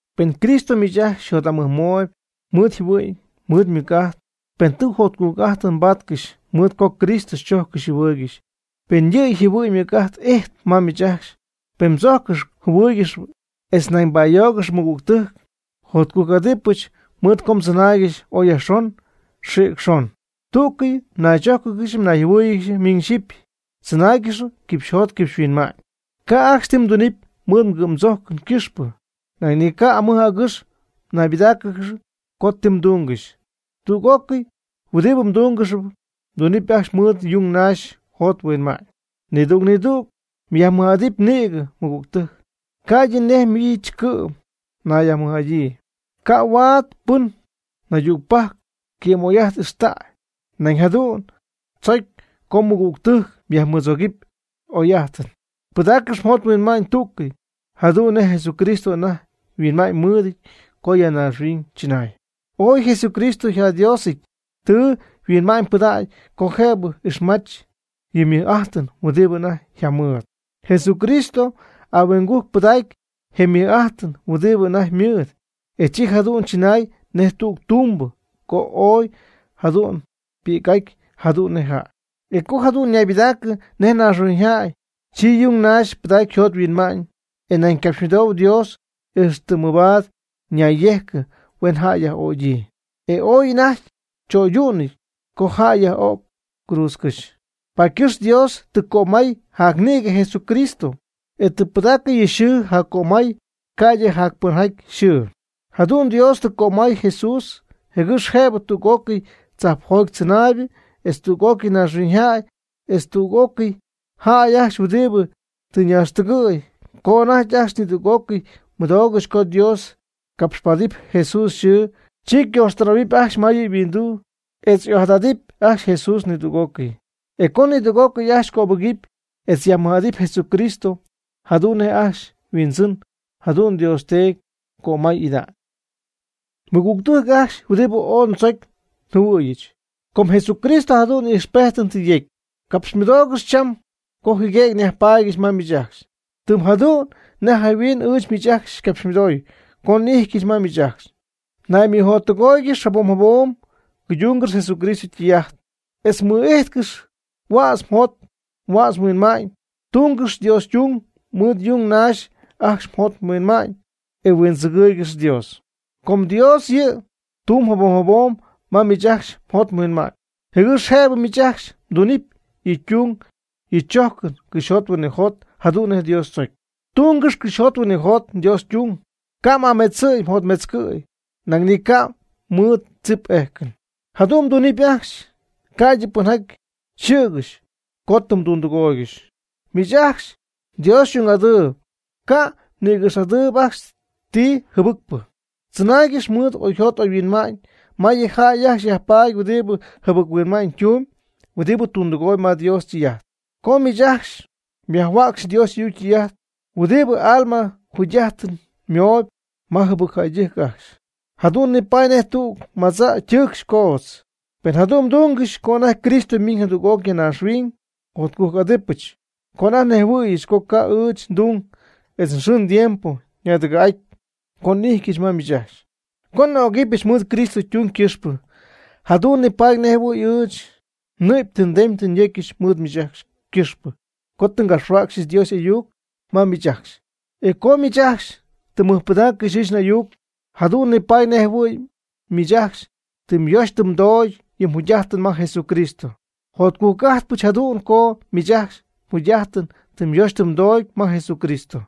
Pen Cristo miich ajcxy mjot'amɨjmooyb mɨɨd yjɨhuɨ'ñ mɨɨd ymɨc'ajt, pen tɨ jotcujc'ajtɨn mbatcɨxy mɨɨd co Cristo xychojccɨxy xyjɨhuɨɨygɨxy, pen yɨ' yjɨhuɨ'ñ ymɨc'ajt ijtp ma miich ajcxy, pen mdzojccɨxyp mjɨhuɨɨygɨxyp etz nañ mba'ayoogɨxy mɨgügtɨjc, jotcujc'adɨpɨch mɨɨd co mdzɨnaaygɨxy ooy yajxon, xïc xon, tügyɨ mnaychójcɨgɨxy mnayjɨhuɨ́ɨyɨgɨxy miñ xyɨpy, tzɨnaaygɨxy quipxyjot quipxyhuinma'ñ. Ca' ajcxy ti mdunɨpy mɨɨd mgɨ'mdzojcɨn ycɨxpɨ. Nañ ni ca' amɨj agɨx naybɨdáacɨgɨxy co ti mdungɨxy. Tüg'ócɨy huɨdibɨ mdungɨxyp, mdunɨ́py ajcxy mɨɨd yung naxy mjot mhuinma'ñ. Nidüg nidüg myajmɨj'adɨpy nïgɨ mɨgügtɨjc, ca'ydɨ nej miich cɨ'm mnayyajmɨj'adyii. Ca' huaad pɨn naydügpajc ycɨ'm'oy'ajt ixtäy, nañ jadu'n tzocy co mɨgügtɨjc myajmɨdzogɨpy y'oy'ajt. Pɨdaaccɨx mjot mhuinma'ñ tú'cɨy jadu'n nej Jesucristo anajty yhuinma'ñ mɨɨdɨty co ya naaxhuiñ chɨnay. Oy Jesucristo yjaDiosɨty tɨ yhuinma'ñypɨdägy co jëbɨ ixmach yɨ' ymɨj'ajtɨn huɨdibɨ anajty yjamɨɨd. Jesucristo ahuingujc pɨdaactay je mɨj'ajt huɨdibɨ anajty ymɨɨd, e chi jadu'n chɨnay nej tüg tumbɨ co oy jadu'n ypi'c'aty jadu'n nej jäy. E co jadu'n ñaybɨdaacɨ nej naaxhuiñyjäy, chi yung naxy pɨdacy yjot yhuinma'ñ, e nañ capxymɨdoy Dios ixtɨ mɨbaad ñayyejcɨ, huen jäy yaj'ögyii. E ooy anajty cho'ydu'nɨty co jäy yaj'o'cɨ cruudzcɨ́xy. Paady ycɨxp Dios tɨ cömay jacnïgɨ Jesucristo, e tɨ pɨdäcɨ yɨ' yxɨɨ jaccömay, ca'ydɨ jacpɨnjäy yxɨɨ. Jadu'n Dios tɨ cömay Jesús, jɨgɨx jëbɨ tüg'ócɨy tzajpjoty tzɨnaaybɨ etz tüg'ócɨy naaxhuiñyjäy, etz tüg'ócɨy jäy ajcxy huɨdibɨ tɨ ñaaxtɨgɨ̈y, co anajty ajcxy nidüg'ócɨy mɨdoogɨxy co Dios capxpaatɨp Jesús yxɨɨ, chi ycojxtɨnaay'ɨhuɨydähuɨpy ajcxy ma yɨ' yhuinduu, etz y'ojadadɨpy ajcxy Jesús nidüg'ócɨy. E co nidüg'ócɨy ajcxy cöbɨgɨpy etz yajmɨj'adɨpy Jesucristo jadu'n nej ajcxy yHuindzɨn, jadu'n Dios Teedy ycömay'ida'ñ. Mɨgügtɨjc ajcxy huɨdibɨ ooy ndzocy njɨhuɨ̈yɨch, com Jesucristo jadu'n ijxpejtɨn tɨ yecy, capxymɨdoogɨch cham co jɨguëgy nyajpaadyɨch ma miich ajcxy, tɨm jadu'n nej jayhuin ɨɨch miich ajcxy xycapxymɨdooy co n'ijtyɨch ma miich ajcxy. Naymɨjottɨgóoyɨgɨx jabom jabom mguydungɨxy Jesucristo ytɨy'ajt etz mmɨ'ijtcɨx huädz mjot huädz mhuinma'ñ. Tungɨx Dios ytung mɨɨd yung naxy ajcxy mjot mhuinma'ñ, e huindzɨgɨɨygɨx Dios. Com Dios yɨ' tumb jabom jabom ma miich ajcxy mjot mhuinma'ñ, jɨgɨx jëbɨ miich ajcxy mdunɨpy yɨ' ytung yɨ' chojcɨn cɨxyjot huinɨjot jadu'n nej Dios tzocy. Tungɨx cɨxyjot huinɨjot Dios ytung, ca'y'aametzɨty yjotmetzɨty, nañ ni ca' mɨɨd tzip ejcɨn. Jadu'n mdunɨpy ajcxy ca'ydɨ pɨnjaty yxɨ̈gɨxy co tɨ mdundɨgooygɨxy. Miich ajcxy Dios xy'ung'adɨɨb, ca' mnïgɨx'adɨɨyb ajcxy ti jɨbɨcpɨ. Tzɨnaaygɨx mɨɨd oyjot oyhuinma'ñ ma yɨ jäy ajcxy yajpaady huɨdi jɨbɨc-huinma'ñ tumb huɨdibɨ tundɨgooyb ma Dios ytɨy'ajt. Co miich ajcxy myajhuäcxy Dios y'ayuc ytɨy'ajt huɨdibɨ alma yjugy'ajtɨn mooyb ma jɨbɨcjäydɨjc ajcxy, jadu'n nipaady nej tüg madzä ytɨɨcxy coodz. Pen jadu'n mdungɨxy, co anajty Cristo ymiiñ jadüg'oc ya naaxhuiñ, jotcujc'adɨpɨch co anajty nnejhuɨ̈yɨch co ca' ɨɨch ndung etz nxɨɨ ndiempo yñadɨgɨ̈'aty co n'íjtyɨch ma miich ajcxy. Co n'ögɨbɨch mɨɨd Cristo ytung ycɨxpɨ, jadu'n nipaady nejjɨhuɨ̈y ɨɨch nnɨ'py tɨ ndem tɨ nyocyɨch mɨɨd miich ajcxy ycɨxpɨ co tɨ ngapxhuäcxɨch Dios y'ayuc ma miich ajcxy. E co miich ajcxy tɨ mmɨjpɨdaaccɨxy ɨɨch n'ayuc, jadu'n nipaady nejjɨhuɨ̈y miich ajcxy tɨ myoxy tɨ mdoogy yɨ mjugy'ajtɨn ma Jesucristo. Jotcujc'ajtpɨch jadu'n co miich ajcxy mjugy'ajtɨn tɨ myoxy tɨ mdoogy ma Jesucristo.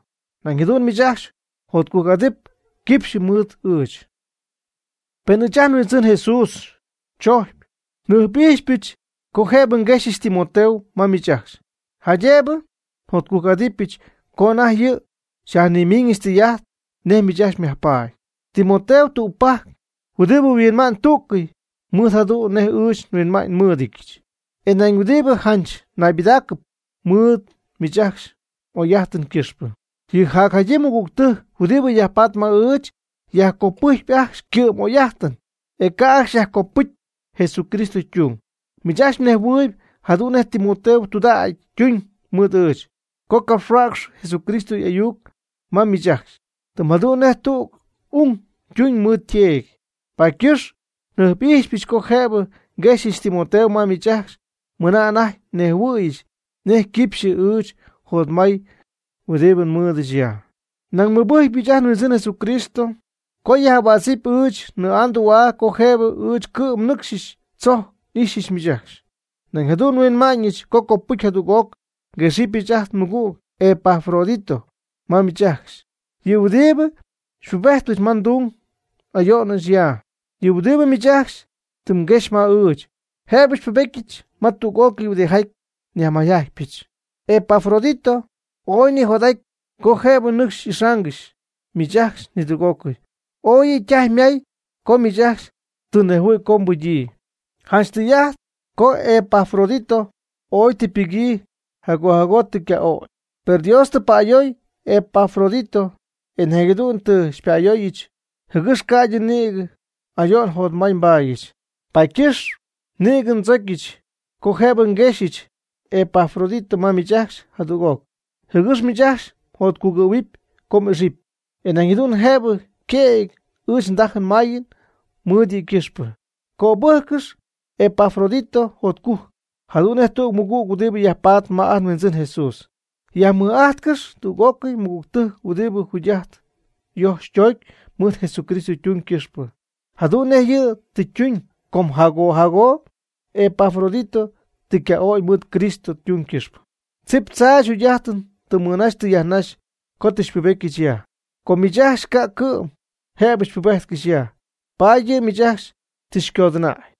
Nañ jadu'n miich ajcxy mjotcujc'adɨpy quipxy mɨɨd ɨɨch. Pen ɨɨch ajt nHuindzɨn Jesús tzojcpy, njɨjp'ijxypɨch co jëbɨ nguexɨpyɨch Timoteo ma miich ajcxy, jaydëbɨ njotcujc'adɨpyɨch co anajty yɨ' xyajnimiiñɨch tɨy'ajt nej miich ajcxy myajpaady. Timoteo tügpajc huɨdibɨ huinma'ñ tú'cɨy mɨɨd jadu'n nej ɨɨch nhuinma'ñ nmɨ́ɨdɨdyɨch, etz nañ huɨdibɨ janch naybɨdaacɨp mɨɨd miich ajcxy m'oy'ajtɨn ycɨxpɨ. Yɨ jacjadyii mɨgügtɨjc huɨdibɨ yajpatp ma ɨɨch, yajcopɨjcpy ajcxy ycɨ'm'oy'ajtɨn, e ca' ajcxy yajcopɨcy Jesucristo ytung. Miich ajcxy mnejhuɨɨyb jadu'n nej Timoteo tudägy ytuñ mɨɨd ɨɨch co ngapxhuäcxyɨch Jesucristo y'ayuc ma miich ajcxy, tɨm jadu'n nej tüg ung ytuñ mɨɨd yteedy. Paady ycɨxp njɨjp'ijxypɨch co jëbɨ nguexyɨch Timoteo ma miich ajcxy mɨna anajty nnejhuɨ̈yɨch nej ycɨxɨpy ɨɨch njotmay huɨdibɨ nmɨɨdɨch ya. Nañ nmɨbɨjcypɨch ajt nHuindzɨn Jesucristo co yaj'ahuädzɨp ɨɨch nnɨɨ'a ndü'a co jëbɨ ɨɨch cɨ'm nɨcxy tzojc n'ixyɨch miich ajcxy. Nañ jadu'n nhuinmaayɨch co copɨcy jadüg'oc nguexɨpyɨch ajt nmɨgüg Epafrodito ma miich ajcxy, yɨ' huɨdibɨ xypubejtpɨch ma ndung n'ayo'nɨch ya. Yɨ' huɨdibɨ miich ajcxy tɨ mguexy ma ɨɨch, jëbɨ xypubetyɨch ma tüg'ócɨy huɨdijaty nyajmayjajtypɨch. Epafrodito ooy nijot'aty co jëbɨ nɨcxy y'ixaangɨxy miich ajcxy nidüg'ócɨy. Ooy yɨ' ytajy ymaay co miich ajcxy tɨ mnejhuɨ̈y co ypɨgyii. Janch tɨy'ajt co Epafrodito ooy tɨ ypɨgyii, jago jago tɨ yca'ögy. Per Dios tɨ pa'ayoy Epafrodito, e nañ jadu'n tɨ xypa'ayooyɨch, jɨgɨx ca'ydɨ nïgɨ ayo'n jotmay nbaadyɨch. Paady ycɨxp nïgɨ ndzocyɨch co jëbɨ nguexɨpyɨch Epafrodito ma miich ajcxy jadüg'oc, jɨgɨx miich ajcxy mjotcugɨ̈huɨp co m'ixɨpy. E nañ jadu'n jëbɨ yquëgy ɨɨch ndajɨn mayɨn mɨɨd yɨ' ycɨxpɨ. Cöbɨjccɨx Epafrodito jotcujc, jadu'n nej tüg mɨgüg huɨdibɨ yajpaatp ma ajt nHuindzɨn Jesús. Yajmɨj'ajtcɨx tüg'ócɨy mɨgügtɨjc huɨdibɨ yjugy'ajtɨn yojxp toocp mɨɨd Jesucristo ytung ycɨxpɨ, jadu'n nej yɨ' tɨ ytuñ. Com jago jago Epafrodito tɨ yca'ögy mɨɨd Cristo ytung ycɨxpɨ. Tzip tzaach yjugy'ajtɨn tɨ mɨnaxy tɨ yajnaxy co tɨ xypubetyɨch ya. Com miich ajcxy ca' cɨ'm jëbɨ xypubéjtcɨxyɨch ya, paady yɨ' miich ajcxy tɨ xycodɨnäy.